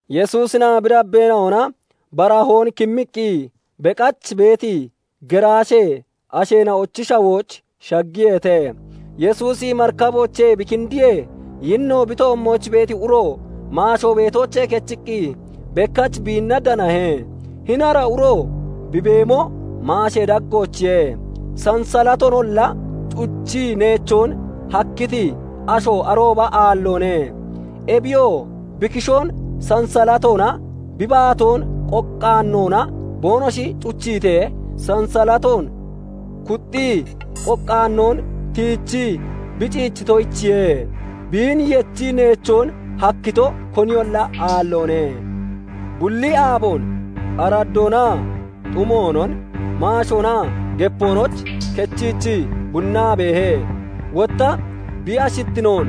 Yesuusinaa bi dabbeena'ona baharoon kimmiqqi beqach beeti geraashee asheena'ochi shawooch shaggiyeete. Yesuusi marikaboochee bi kindiyee, yinno bi toommooch beeti uro maasho beetoochee kechiqqi bekkach biinna danahe. Hini ara uro bi beemo maashee daggoochiye. Sansallatoonolla cuchii neechon hakkiti asho arooba aalloone. Ebiyoo bi kishoon sansalatoonaa bi baatoon qoqqaanoona boonoshi cuchiitee, sansalatoon kuxxii qoqqaanoon tiichii bi ciichitoyichiye; biin yechii neechoon hakkito koniyolla aalloone. Bulli aaboon araddoonaa xumoonon maashoonaa gepoonooch kechiichii bunnaa beehe; wotta bi ashittinoon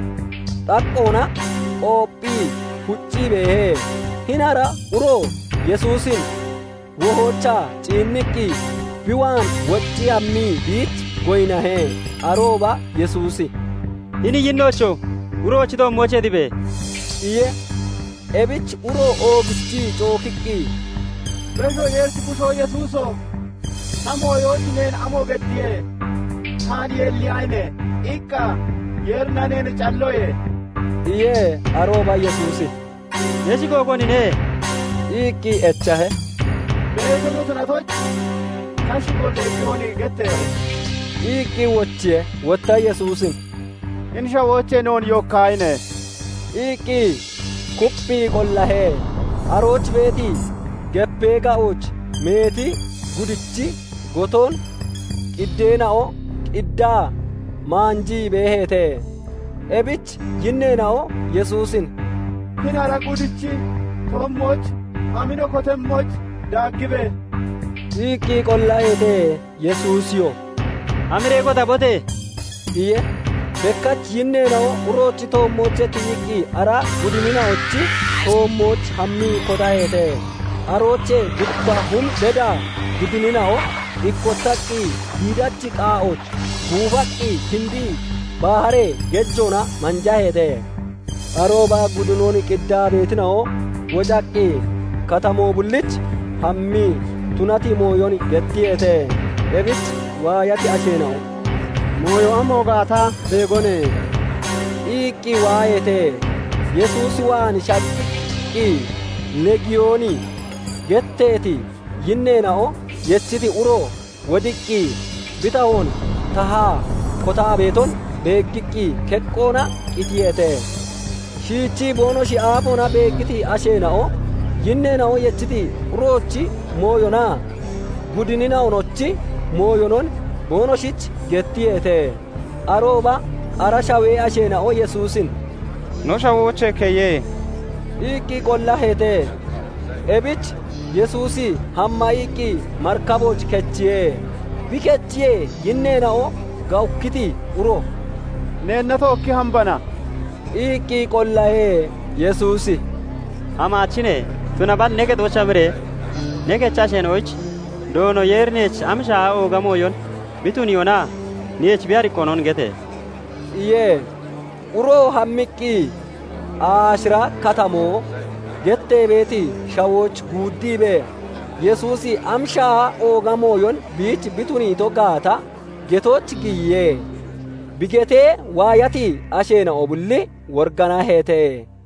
xaqqoona qoopphii huccii beehe. Hini ara uro Yesuusin wohoochaa ciinniqqi bi waan woccii hammii biich goyinnahe. Arooba Yesuusi "Hini yinnoocho! Uroochi toommoochee tibe!" iye. Ebich uro oogichii cookkiqqi, "Beshoo Yeerichi Bushoo Yesuuso! Ta mooyooch neen amo geddiye? 'Taan yulliyaahine!' iqqa Yeerina neen calloye" iye. Arooba Yesuusi "Ne shigo konine?" iqqi echahe. "Meeto no tunatoyich, ta shigo 'Leegiyooni' getteehe" iqqi wochiye. Wotta Yesuusin "Hini shawoochee noon yookkaahine!" iqqi kupphii qollahe. Arooch beeti gepee ga'ooch meeti gudichi goton qideena'o qiddaa maanjii beeheete. Ebich yinneena'o Yesuusin "Hini ara gudichi toommooch hami no kotemmoyich daaggibe!" iqqi qollaheete. Yesuusiyoo "Hamiree kotabote!" iye. Bekkach yinneena'o uroochi toommoochee tiyiqqi ara gudinina'ochi toommooch hammii kotaheete. Aroochee gutta hum beda gudinina'o ikkotaqqi giidachi qaa'ooch guufaqqi kindii baharee gejoona manjeeheete. Arooba gudinon qiddaa beetina'o wocaqqi katamoo bulliich hammii tunati mooyon gettiyeete. Ebich waayati asheena'o "Mooyo amo gaata beegone" iqqi waaheete. Yesuus waan shaggiqqi, "Leegiyooni" getteeti yinneena'o yechiti uro wodiqqi, bi tahoon tahaa kotaa beeton beeggiqqi keqqoona qitiyeete. Shiichii boonoshi aafoona beeggiti asheena'o yinneena'o yechiti uroochi mooyonaa gudinina'onochi mooyonon boonoshich gettiyeete. Arooba ara shawee asheena'o Yesuusin "No shawoochee keye!" iqqi qollaheete. Ebich Yesuusi hamma iqqi marikabooch kechiye; bi kechiyee, yinneena'o gawukkiti uro "Neenna tookkii hambana" iqqi qollahe. Yesuusi "Hamaachine; tunaballi ne kexooch hamiree ne kechi asheena'oyich Doono Yeeri neech am shaaha ooga mooyon bi tuniyoonaa neech bi ariqoonon gete!" iye. Uroo hammiqqi, "Aashira katamo" gettee beeti shawooch guuddiibee Yesuusi am shaaha ooga mooyon biich bi tuniito gaata getooch giyiye; bi gettee waayati asheena'o bulli woriganaheete.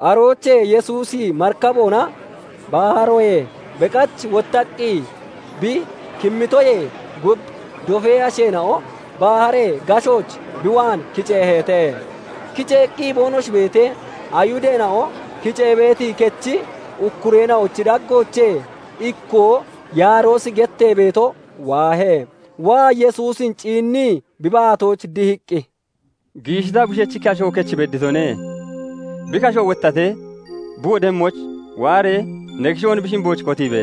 Aroochee Yesuusi marikaboona baharoyee beqach wottaqqi bi kimmitoyee gub dofee asheena'o baharee gashooch bi waan kiceeheete. Kiceeqqi boonoshi beetee, Ayihudeena'o kicee beeti kechi ukkureena'ochi daggoochee ikkoo Yaaroosi gettee beeto waahe. Waa Yesuusin ciinnii bi baatooch dihiqqi, "Giishi ta bushechi kasho kech bedditone. Bi kasho wottatee bi wodemmoyich waaree ne kishoon bi shimbooch kotiibe!"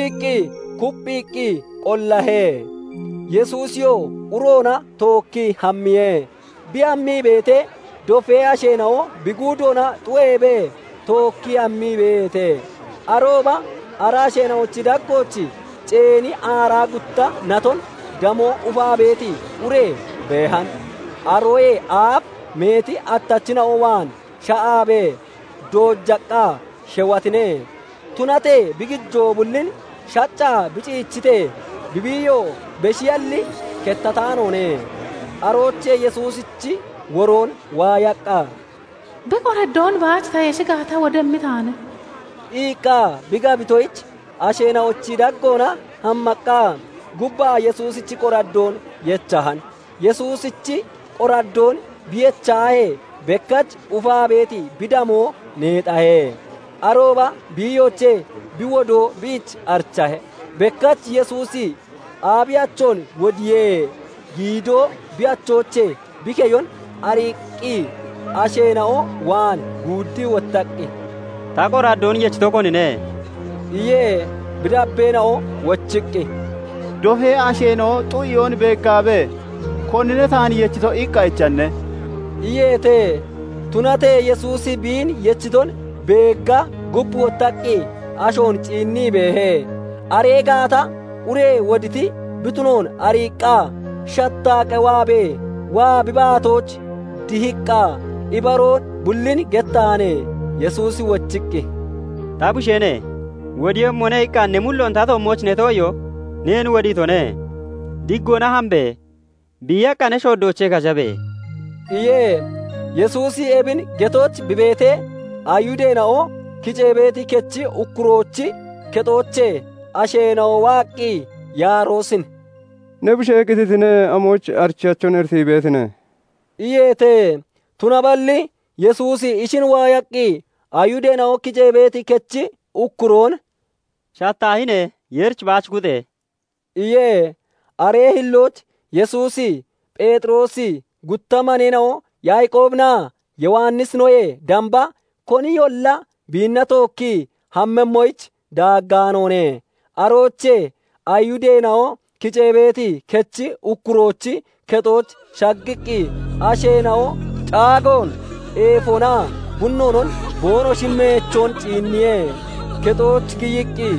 iqqi kupphiiqqi qollahe. Yesuusiyoo uroona tookkii hammiye. Bi hammii beetee, dofee asheena'o bi guudoona xu'eebee tookkii hammii beeheete. Arooba ara asheena'ochi daggooch ceeni aaraa gutta naton damoo ufaa beeti ure beehan. Aroyee aaf meeti attachina'o waan sha'aabee doojaqqa sheweetine; tunatee bi gijoo bullin shaccaa bi ciichitee, bi biiyoo beshiyalli kettataanoone. Aroochee Yesuusichi woroon waayaqqa, "Bi qoraddoon baach ta yeshi gaata, wodemmi taane" iqqa bi gabitoyich asheena'ochi daggoona hammaqqa gubbaa Yesuusichi qoraddoon yechan. Yesuusichi qoraddoon bi yechahee, bekkach ufaa beeti bi damoo neexahe. Arooba biiyoochee bi wodoo biich arichahe. Bekkach Yesuusi abiiyachon wodiyee giidoo bi achoochee bi keyon ariiqqi asheena'o waan guuddii wottaqqi, "Ta qoraddoon yechito konine?" iye. Bi dabbeena'o wochiqqi, "Dofee asheena'o xu'eyoon beeggaabee, 'Konine taan yechito?' iqqa echanne?" iyeete. Tunatee Yesuusi biin yechiton beegga gub wottaqqi ashoon ciinnii beehe. Aree gaata ure woditi bi tunoon ariiqqa shattaa qewaabee, waa bi baatooch dihiqqa ibaroo bullin gettahan. Yesuusi wochiqqi, "Ta busheene! 'Wodiiyemmone' iqqa ne mulloon ta toommooch ne too'iyoo neen wodiitone. Diggoona hambe! Biiyaqqa ne shooddoochee kashabe!" iye. Yesuusi ebin getooch bi beetee, Ayihudeena'o kicee beeti kechi ukkuroochi kexoochee asheena'o waaqqi Yaaroosin "Ne bushee qititine. Amoyich arichiyachon iritii beetine?" iyeete. Tunaballi Yesuusi ishin waayaqqi Ayihudeena'o kicee beeti kechi ukkuroon "Shattaahine! Yeerich baach kuxe!" iye. Aree hillooch Yesuusi Pheexiroosi, gutta maneena'o Yaaqoobinaa Yowannisinoyee damba koniyolla biinna tookki hammemmoyich daaggaanoone. Aroochee Ayihudeena'o kicee beeti kechi ukkuroochi kexooch shaggiqqi asheena'o caagoon, eefonaa bunnoonon boonoshi meechoon ciinniye. Kexooch giyiqqi,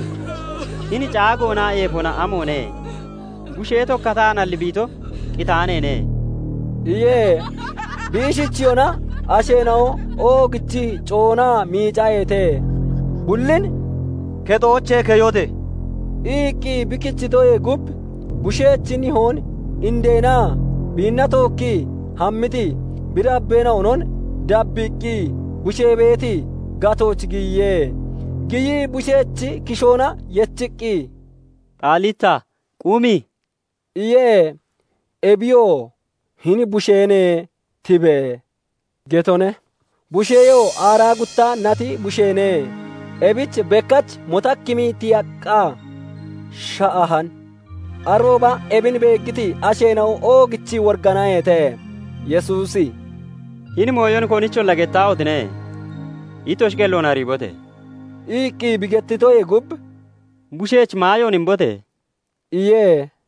"Hini caagoonaa eefoona amoone? Bushee tokkataanalli bi ito, qitaaneene" iye. Bi ishichiyona asheena'o oogichii coonaa miicaheete. Bullin "Kexoochee keyote!" iqqi bi kichitoyee gub bushechi nihoon, indeenaa biinna tookkii hammiti bi dabbeena'onon dabbiiqqi bushee beeti gatooch giyiye. Giyii bushechi kishoona yechiqqi, "Xaallita! Qumi!" iye; ebiyoo "Hini busheene! Tibe!" getone. Busheyoo aaraa gutta nati busheene; ebich bekkach motakkimii tiyaqqa sha'ahan. Arooba ebin beeggiti asheena'o oogichii woriganaheete. Yesuusi "Hini mooyon konicholla gettaahotine! Ittoshi qelloon ariibote!" iqqi bi gettitoyee gub, "Bushech maayoon imbote!" iye.